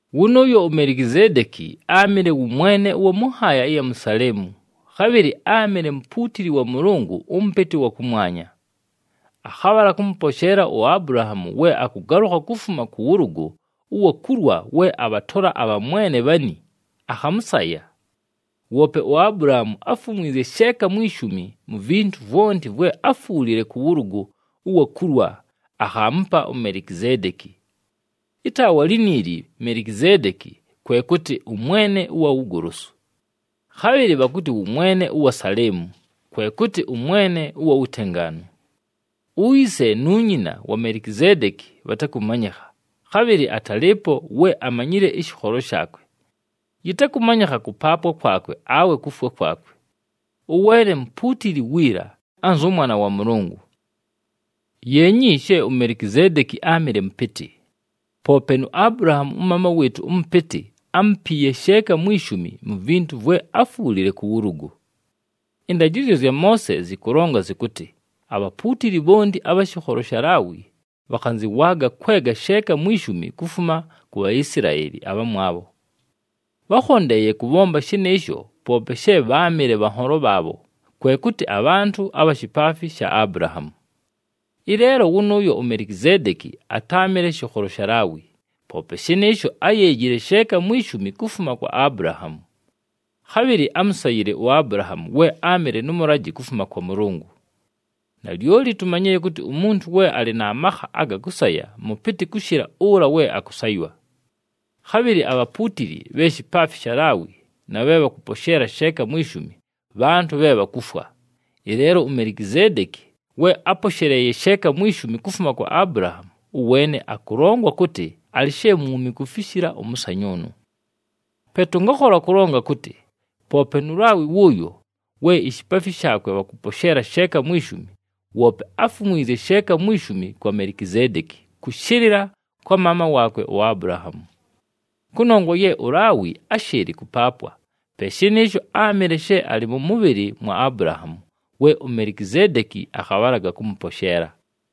Wʉnʉʉyo uMelikizeedeki áamɨle wʉ mwene ʉwa mʉ nhaaya ɨya mu Saleemu, khabhɨlɨ áamɨle mupuutili wa Mʉlʉngʉ ʉMʉpɨtɨ ʉwa kʉmwanya. Akhabhala kʉmʉposheela uAbulahaamu we akʉgalʉkha kufuma kʉ wʉlʉgʉ ʉwa kulwa we abhatola abhamwene bhani, akhamʉsaya. Woope uAbulahaamu áfumwizye sheeka mwi shumi mu vintu vwonti vwe áfwulile kʉ wʉlʉgʉ ʉwa kulwa akhaamupa uMelikizeedeki. Ɨtaawa liniili Melikizeedeki, kwe kʉtɨ, “Ʉmwene ʉwa Wugolosu.” Khabhɨlɨ bhakʉtɨ wʉ mwene ʉwa Saleemu, kwe kʉtɨ, “Ʉmwene ʉwa Wutengaanu.” Uyise nu nyina wa Melikizeedeki bhatakʉmanyɨkha, khabhɨlɨ atalɨɨpo we amanyile ɨshɨkholo shaakwe. Yɨtakʉmanyɨkha kʉpaapwa kwakwe awe kufwa kwakwe. Ʉweene mupuutili wiila, anzʉ Mwana wa Mʉlʉngʉ. Yeenyi she uMelikizeedeki áamɨle mʉpɨtɨ! Poope nu Abulahaamu ʉmaama wɨɨtʉ ʉmʉpɨtɨ, ámupiiye sheeka mwi shumi mu vintu vwe áfwulile kʉ wʉlʉgʉ. Ɨndajɨzyo zya Moose zɨkʉlonga zɨkʉtɨ, abhapuutili bhonti abha shɨkholo sha Laawi, bhakhanzɨwaaga kwega sheeka mwi shumi kufuma ku Bhaisilaeli abhamwabho. Bhákhondeeye kʉbhomba shɨnɨɨsho poope she bháamɨle bhanholo bhaabho, kwe kʉtɨ abhantʉ abha shipaafi sha Abulahaamu. Ɨleelo wʉnʉʉyo uMelikizeedeki atáamɨle shɨkholo sha Laawi, poope shɨnɨɨsho áyeejile sheeka mwi shumi kufuma kwa Abulahaamu. Khabhɨlɨ ámusayile uAbulahaamu we áamɨle nʉ mʉlajɨ kufuma kwa Mʉlʉngʉ. Nalyoli tumanyile kʉtɨ umuntu we alɨ na makha aga kʉsaya mʉpɨtɨ kʉshɨla ʉla we akʉsaywa. Khabhɨlɨ abhapuutili bhe shipaafi sha Laawi na bhe bhakʉposheela sheeka mwi shumi, bhantʉ bhe bhakufwa. Ɨleelo uMelikizeedeki we áposheleeye sheeka mwi shumi kufuma kwa Abulahaamu, ʉweene akʉlongwa kʉtɨ alɨ she mwumi kufishila ʉmʉsanyʉʉnʉ. Pe tʉngakhola kʉlonga kʉtɨ, poope nu Laawi wʉʉyo, we ishipaafi shaakwe bhakʉposheela sheeka mwi shumi, woope áfumwizye sheeka mwi shumi kwa Melikizeedeki kʉshɨlɨla kwa maama waakwe uAbulahaamu. Kʉnongwa ye uLaawi áshɨɨlɨ kʉpaapwa, pe shɨnɨɨsho áamɨle she alɨ mʉ mʉbhɨlɨ mwa Abulahaamu we uMelikizeedeki akhabhalaga kʉmʉposheela.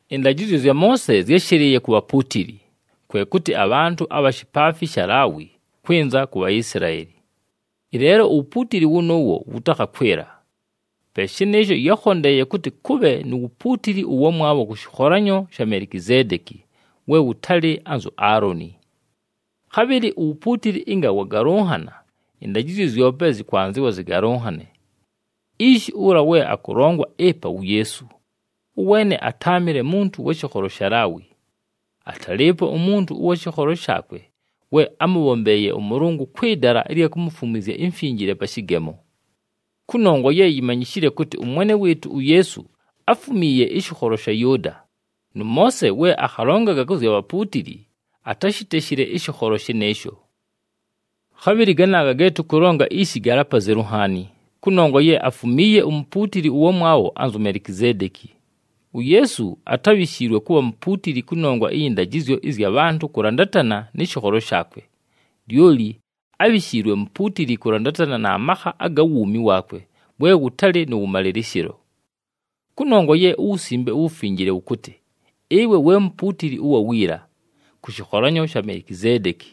Ɨndajɨzyo zya Moose zyáshɨlɨɨye ku bhapuutili, kwe kʉtɨ abhantʉ abha shipaafi sha Laawi kwɨnza ku Bhaisilaeli. Ɨleelo uwupuutili wʉnʉʉwo wʉtakhakwɨla. Pe shɨnɨɨsho yákhondeeye kʉtɨ kʉbhe nu wupuutili ʉwamwabho kʉ shɨkholanyo sha Melikizeedeki we wʉtalɨ anzu Aaloni. Khabhɨlɨ uwupuutili ɨnga wagalʉnhana, ɨndajɨzyo zyope yɨkwanzɨwa zɨgalʉnhane. Ishi ʉla we akʉlongwa ɨpa wu Yeesu, ʉweene atáamɨle muntu wa shɨkholo sha Laawi. Atalɨɨpo umuntu ʉwa shɨkholo shaakwe we ámʉbhombeeye ʉMʉlʉngʉ kwɨ dala ɨlya kumufumwizya imfinjile pa shɨgemo. Kʉnongwa ye yimanyishile kʉtɨ ʉMwene wɨɨtʉ uYeesu áfumiiye ɨshɨkholo sha Yʉʉda, nʉ Moose we akhalongaga kʉ zya bhapuutili, atáshiteshile ɨshɨkholo shɨnɨɨsho. Khabhɨlɨ ganaaga ge tʉkʉlonga ishi galɨ apazelu nhaani, kʉnongwa ye afumiiye umupuutili ʉwamwabho anzu Melikizeedeki. UYeesu atábhishiilwe kʉbha mupuutili kʉnongwa ɨyɨ ndajɨzyo ɨzya bhantʉ kʉlandatana nɨ shɨkholo shaakwe, lyoli ábhishiilwe mupuutili kʉlandatana na makha aga wuumi waakwe we wʉtalɨ nʉ wʉmalɨlɨshɨlo. Kʉnongwa ye uWusimbe uWufinjile wʉkʉtɨ, “Ɨwe we mupuutili ʉwa wiila, kʉ shɨkholanyo sha Melikizeedeki.”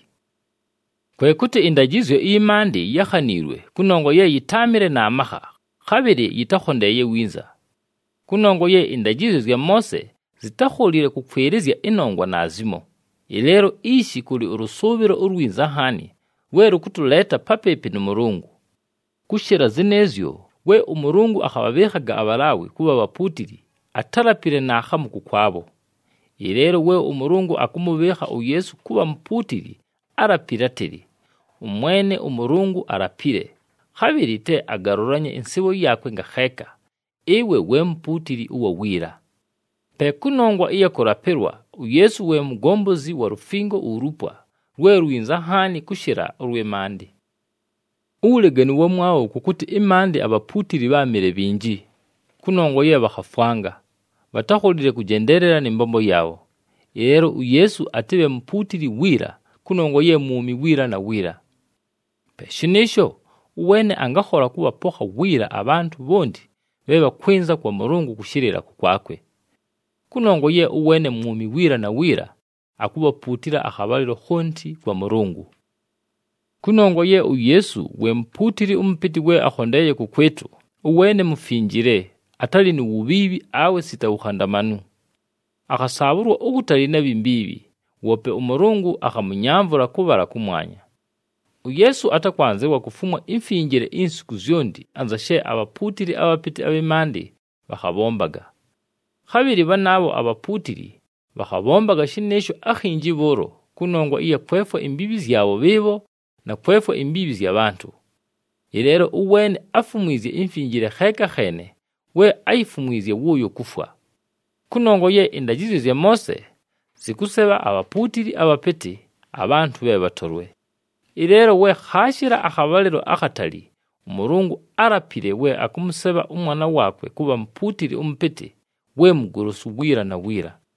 Kwe kʉtɨ ɨndajɨzyo ɨyɨ maandɨ yákhaniilwe kʉnongwa ye yɨtáamɨle na makha, khabhɨlɨ yɨtakhondeeye winza. Kʉnongwa ye ɨndajɨzyo zya Moose, zitákholile kʉkwɨlɨzya ɨnongwa naazimo, ɨleelo ishi kʉlɨ ʉlʉsʉʉbhɨlo ulwinza nhaani, lwe lʉkʉtʉleeta papɨɨpɨ nʉ Mʉlʉngʉ. Kʉshɨla zɨnɨɨzyo, we ʉMʉlʉngʉ akhabhabhɨɨkhaga aBhalaawi kʉbha bhapuutili atálapile naakhamu kʉkwabho. Ɨleelo we ʉMʉlʉngʉ akʉmʉbhɨɨkha uYeesu kʉbha Mupuutili álapile átɨlɨ, “ɄMwene ʉMʉlʉngʉ alapile, khabhɨlɨ te agalʉlanye ɨnsɨɨbho yaakwe ngakheeka, ‘Ɨwe we mupuutili ʉwa wiila.’” Pe kʉnongwa ɨya kʉlapɨlwa, uYeesu we mugombozi wa lufingo ulupwa, lwe lwinza nhaani kʉshɨla ʉlwɨ maandɨ. Uwuleganu ʉwamwabho kʉ kʉtɨ ɨmaandɨ abhapuutili bháamɨle bhinji, kʉnongwa ye bhakhafwanga. Bhatákholile kʉjendeelela nɨ mbombo yaabho. Ɨleelo uYeesu atɨbhe mupuutili wiila kʉnongwa ye mwumi wiila na wiila. Pe shɨnɨɨsho, ʉweene angakhola kʉbhapokha wiila abhantʉ bhonti bhe bhakwɨnza kwa Mʉlʉngʉ kʉshɨlɨla kʉkwakwe. Kʉnongwa ye ʉweene mwumi wiila na wiila, akubhapuutila akhabhalɨlo khonti kwa Mʉlʉngʉ. Kʉnongwa ye uYeesu we mupuutili ʉmʉpɨtɨ we akhondeeye kʉkwɨtʉ, ʉweene mufinjile, atalɨ nu wubhiibhi, awe sita wukhandamanu. Akhasaabhʉlwa ukutali na bhi mbiibhi, woope ʉMʉlʉngʉ akhamʉnyamvʉla kʉbhala kʉmwanya. UYeesu atakwanzɨwa kufumwa imfinjile insiku zyonti anza she abhapuutili abhapɨtɨ abhɨ maandɨ bhakhabhombaga. Khabhɨlɨ bhanaabho abhapuutili bhakhabhombaga shɨnɨɨsho akhinji bhʉʉlo kʉnongwa ɨya kwefwa imbiibhi zyabho bhɨɨbho, na kwefwa imbiibhi zya bhantʉ. Ɨleelo ʉweene áfumwizye imfinjile kheeka kheene, we áyifumwizye wʉʉyo kufwa. Kʉnongwa ye ɨndajɨzyo zya Moose zɨkʉsebha abhapuutili abhapɨtɨ, abhantʉ bhe bhatolwe. Ɨleelo we khaashɨla akhabhalɨlo akhatali, ʉMʉlʉngʉ álapile we akʉmʉsebha ʉMwana waakwe kʉbha mupuutili ʉmʉpɨtɨ we mugolosu wiila na wiila.